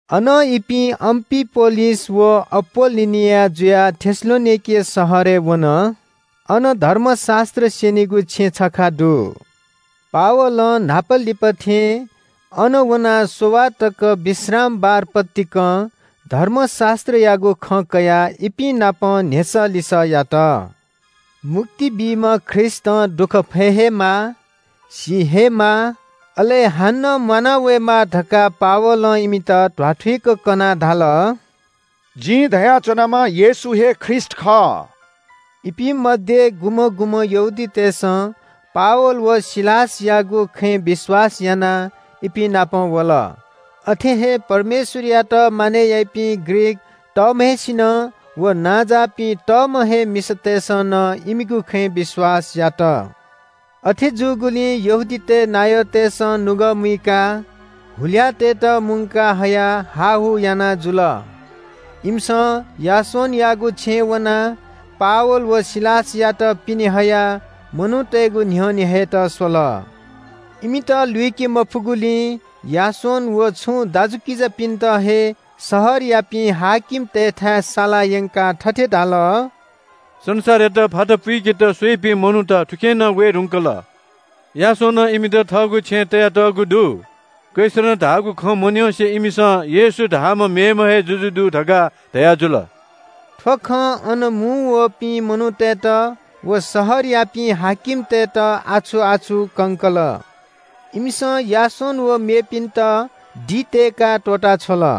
अनं इपिं अम्‍फिपोलिस व अपोल्‍लोनिया जुयाः थेसलोनिके शहरय् वन। अन धर्मशास्‍त्र स्‍यनीगु छेँ छखा दु। पावलं न्‍हापालिपा थें अन वनाः स्‍ववाः तक विश्रामबार पतिकं धर्मशास्‍त्रयागु खँ कयाः इपिं नाप न्‍ह्यसः लिसः यात। मुक्ति बीम्‍ह ख्रीष्‍टं दुःख फये हे माः, सी हे माः, अले हानं म्‍वाना वयेमाः धकाः पावलं इमित ध्‍वाथुइक कनाः धाल – “जिं धया च्‍वनाम्‍ह येशू हे ख्रीष्‍ट खः।” इपिं मध्‍ये गुम्‍हं गुम्‍हं यहूदीतय्‌सं पावल व सिलासयागु खँय् विश्‍वास यानाः इपिं नाप वल। अथे हे परमेश्‍वरयात मानय् याइपिं ग्रीक तःम्‍हय्‌सिनं व नांजाःपिं तःम्‍ह हे मिसातय्‌सं नं इमिगु खँय् विश्‍वास यात। अथे जूगुलिं यहूदीतय् नायःतय्‌सं नुगः मुइकाः हुल्‍याःतय्‌त मुंका हयाः हाःहू याना जुल। इमिसं यासोनयागु छेँय् वनाः पावल व सिलासयात पिने हयाः मनूतय्‌गु न्‍ह्यःने हयेत स्‍वल। इमित लुइके मफुगुलिं यासोन व सुं मेपिं दाजुकिजापिन्‍त हे शहरयापिं हाकिमतय्‌थाय् साला यंकाः थथे धाल – “संसारयात फाता पुइकेत स्‍वइपिं मनूत थुखे नं वये धुंकल। यासोनं इमित थःगु छेँय् तयातःगु दु। कैसरं धाःगु खँ मन्‍यंसे इमिसं येशू धाःम्‍ह मेम्‍ह हे जुजु दु धकाः धयाजुल।” थ्‍व खं अन मुंवःपिं मनूतय्‌त व शहरयापिं हाकिमतय्‌त आछु-आछु कंकल। इमिसं यासोन व मेपिन्‍त दि तय्‌काः त्‍वःता छ्वल।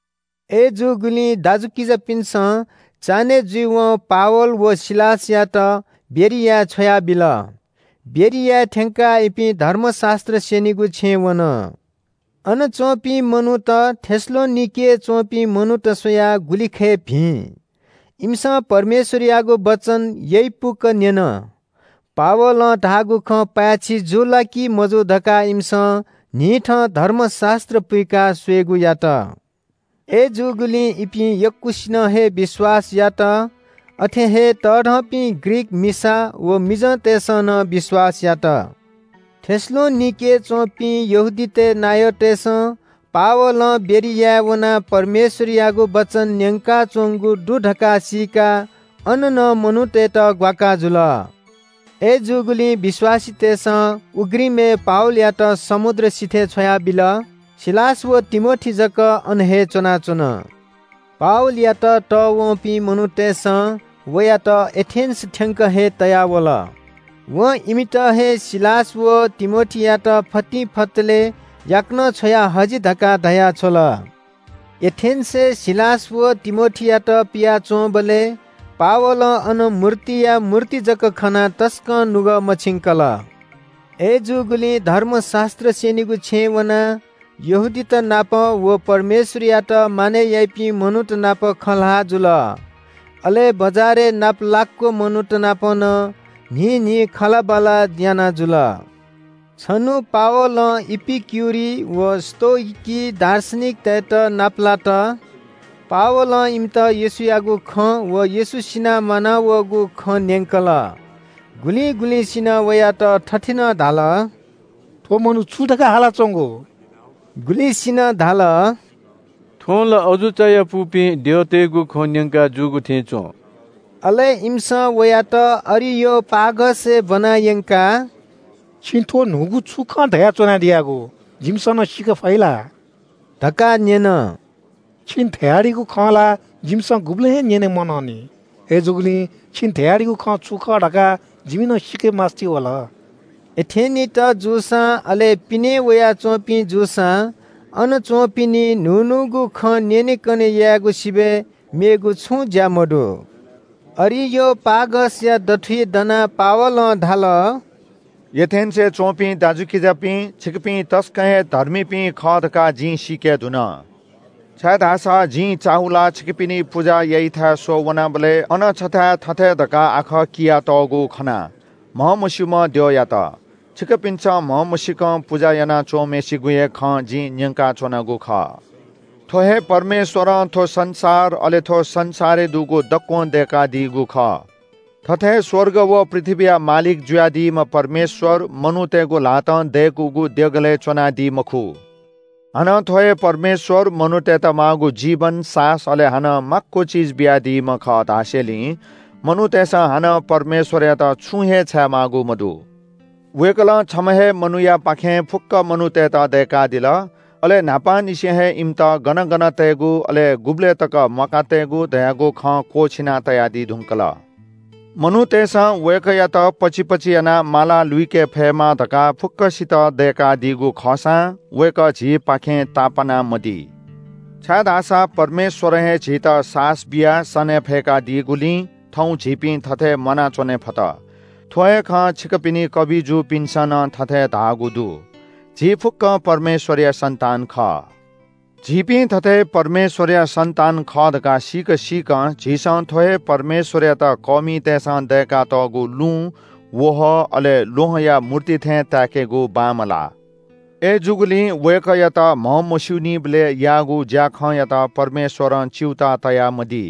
अय्‌जूगुलिं दाजुकिजापिन्‍सं चान्‍हय् जुइवं पावल व सिलासयात बेरियाय् छ्वयाबिल। बेरियाय् थ्‍यंकाः इपिं धर्मशास्‍त्र स्‍यनीगु छेँय् वन। अन च्‍वंपिं मनूत थेसलोनिकेय् च्‍वंपिं मनूत स्‍वयाः गुलिखय् भिं। इमिसं परमेश्‍वरयागु वचन यइपुक न्‍यन। पावलं धाःगु खँ पाय्‌छि जू ला कि मजू धकाः इमिसं न्‍हिथं धर्मशास्‍त्र पुइकाः स्‍वयेगु यात। अय्‌जूगुलिं इपिं यक्‍वसिनं हे विश्‍वास यात। अथे हे तःधंपिं ग्रीक मिसा व मिजंतय्‌सं नं विश्‍वास यात। थेसलोनिकेय् च्‍वंपिं यहूदीतय् नायःतय्‌सं पावलं बेरियाय् वनाः परमेश्‍वरयागु वचन न्‍यंकाच्‍वंगु दु धकाः सीकाः अन नं मनूतय्‌त ग्‍वाकाः जुल। अय्‌जूगुलिं विश्‍वासीतय्‌सं उघ्रिमय् पावलयात समुद्र सिथय् छ्वयाबिल। सिलास व तिमोथी जक अन हे च्‍वनाच्‍वन। पावलयात तःवंपिं मनूतय्‌सं वयात एथेन्‍स थ्‍यंक हे तया वल। वं इमित हे सिलास व तिमोथीयात फतिंफतले याकनं छ्वया हजि धकाः धया छ्वल। एथेन्‍सय् सिलास व तिमोथीयात पियाच्‍वंबलय् पावलं अन मूर्तिया मूर्ति जक खनाः तसकं नुगः मछिंकल। अय्‌जूगुलिं धर्मशास्‍त्र स्‍यनीगु छेँय् वनाः यहूदीत नाप व परमेश्‍वरयात मानय् याइपिं मनूत नाप खँ ल्‍हाः जुल। अले बजारय् नापलाक्‍व मनूत नाप नं न्‍हिं न्‍हिं खँल्‍हाबल्‍हा याना जुल। छन्‍हु पावलं इपिक्‍युरी व स्‍तोइकी दार्शनिकतय्‌त नापलात। पावलं इमित येशूयागु खँ व येशू सिनाः म्‍वानावःगु खँ न्‍यंकल। गुलिं गुलिंसिनं वयात थथे नं धाल – “थ्‍व मनू छु धकाः हालाच्‍वंगु?” गुलिसिनं धाल – “थ्‍वं ला अजू चायापुपिं द्यःतय्‌गु खँ न्‍यंकाजूगु थें च्‍वं।” अले इमिसं वयात अरियोपागसय् ब्‍वना यंकाः – “छिं थ्‍व न्‍हूगु छु खँ धया च्‍वनादियागु? जिमिसं नं सीके फइ ला?” धकाः न्‍यन। “छिं धयादीगु खँ ला जिमिसं गुबलें हे न्‍यने मनंनि। अय्‌जूगुलिं छिं धयादीगु खँ छु खः धकाः जिमि नं सीकेमास्‍ति वल।” एथेनीत जूसां, अले पिनें वयाच्‍वंपिं जूसां अन च्‍वंपिनि न्‍हू न्‍हूगु खँ न्‍यनेकने यायेगु सिबय् थःगु ई मेथाय्‌ बी मखु। अरियोपागसया दथुइ दनाः पावलं धाल – “एथेन्‍सय् च्‍वंपिं दाजुकिजापिं, छिकपिं तसकं हे धर्मीपिं खः धकाः जिं सीके धुन। छाय्‌धाःसा जिं चाःहुलाः छिकपिनि पुजा याइथाय् स्‍वः वनाबलय् अन छथाय् थथे धकाः आखः कियातःगु खना – ‘म्‍हमस्‍यूम्‍ह द्यःयात।’ छिकपिन्‍सं म्‍हमसीकं पुजा याना च्‍वंम्‍हय्‌सिगु हे खँ जिं न्‍यंकाच्‍वनागु खः। “थ्‍व हे परमेश्‍वरं थ्‍व संसार, अले थ्‍व संसारय् दुगु दक्‍वं दय्‌कादीगु खः। थथे स्‍वर्ग व पृथ्‍वीया मालिक जुयादीम्‍ह परमेश्‍वर मनूतय्‌गु ल्‍हातं दय्‌कूगु देगलय् च्‍वनादी मखु। हानं थ्‍व हे परमेश्‍वर मनूतय्‌त माःगु जीवन, सासः, अले हानं माक्‍व चिज बियादीम्‍ह खः धासेंलि मनूतय्‌सं हानं परमेश्‍वरयात छुं हे छायेमाःगु मदु। वय्‌कलं छम्‍ह हे मनूयापाखें फुक्‍क मनूतय्‌त दय्‌कादिल। अले न्‍हापांनिसें हे इमित गन गन तयेगु, अले गुबलय् तक म्‍वाका तयेगु धयागु खँ क्‍वःछिना तयादी धुंकल। “मनूतय्‌सं वय्‌कःयात पचिपचि यानाः माला लुइके फयेमा धकाः फुक्‍कसित दय्‌कादीगु खःसां वय्‌कः झीपाखें तापाना मदी। ‘छाय्‌धाःसा परमेश्‍वरं हे झीत सासः बियाः सने फय्‌कादीगुलिं थौं झीपिं थथे म्‍वानाच्‍वने फत।’ थ्‍व हे खँ छिकपिनि कबिजुपिन्‍सं नं थथे धाःगु दु – ‘झी फुक्‍कं परमेश्‍वरया सन्‍तान खः।’ झीपिं थथे परमेश्‍वरया सन्‍तान खः धकाः सीक सीकं, झीसं थ्‍व हे परमेश्‍वरयात कःमितय्‌सं दय्‌कातःगु लुँ, वहः, अले ल्‍वहंया मूर्ति थें ताय्‌केगु बांमलाः। “अय्‌जूगुलिं वय्‌कःयात म्‍हमस्‍यूनीबलय् याःगु ज्‍याखँयात परमेश्‍वरं च्‍यूताः तयामदी।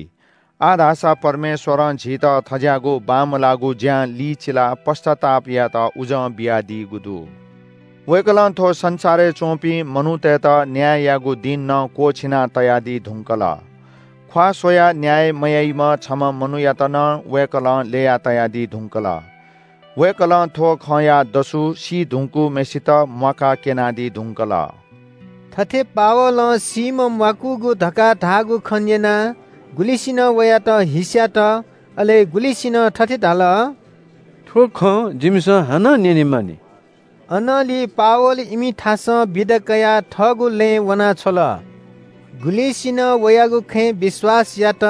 आः धाःसा परमेश्‍वरं झीत थज्‍याःगु बांमलाःगु ज्‍यां लिचिलाः पश्‍चाताप यायेत उजं बियादीगु दु। वय्‌कलं थ्‍व संसारय् च्‍वंपिं मनूतय्‌त न्‍याय यायेगु दिं नं क्‍वःछिना तयादी धुंकल। ख्‍वाः स्‍वयाः न्‍याय मयाइम्‍ह छम्‍ह मनूयात नं वय्‌कलं ल्‍यया तयादी धुंकल। वय्‌कलं थ्‍व खँया दसु सी धुंकूम्‍हय्‌सित म्‍वाकाः क्‍यनादी धुंकल।” थथे पावलं सीम्‍ह म्‍वाकूगु धकाः धाःगु खँ न्‍यनाः गुलिसिनं वयात हिस्‍यात, अले गुलिसिनं थथे धाल – “थ्‍व खँ जिमिसं हानं न्‍यने मानि।” अनंलि पावल इमिथासं बिदा कयाः थःगु लँय् वना छ्वल। गुलिसिनं वयागु खँय् विश्‍वास यात।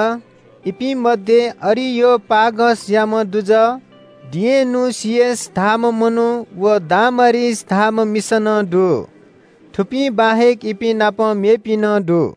इपिं मध्‍ये अरियोपागसयाम्‍ह दुजः डियनुसियस धाःम्‍ह मनू व दामारिस धाःम्‍ह मिसा नं दु। थुपिं बाहेक इपिं नाप मेपिं नं दु।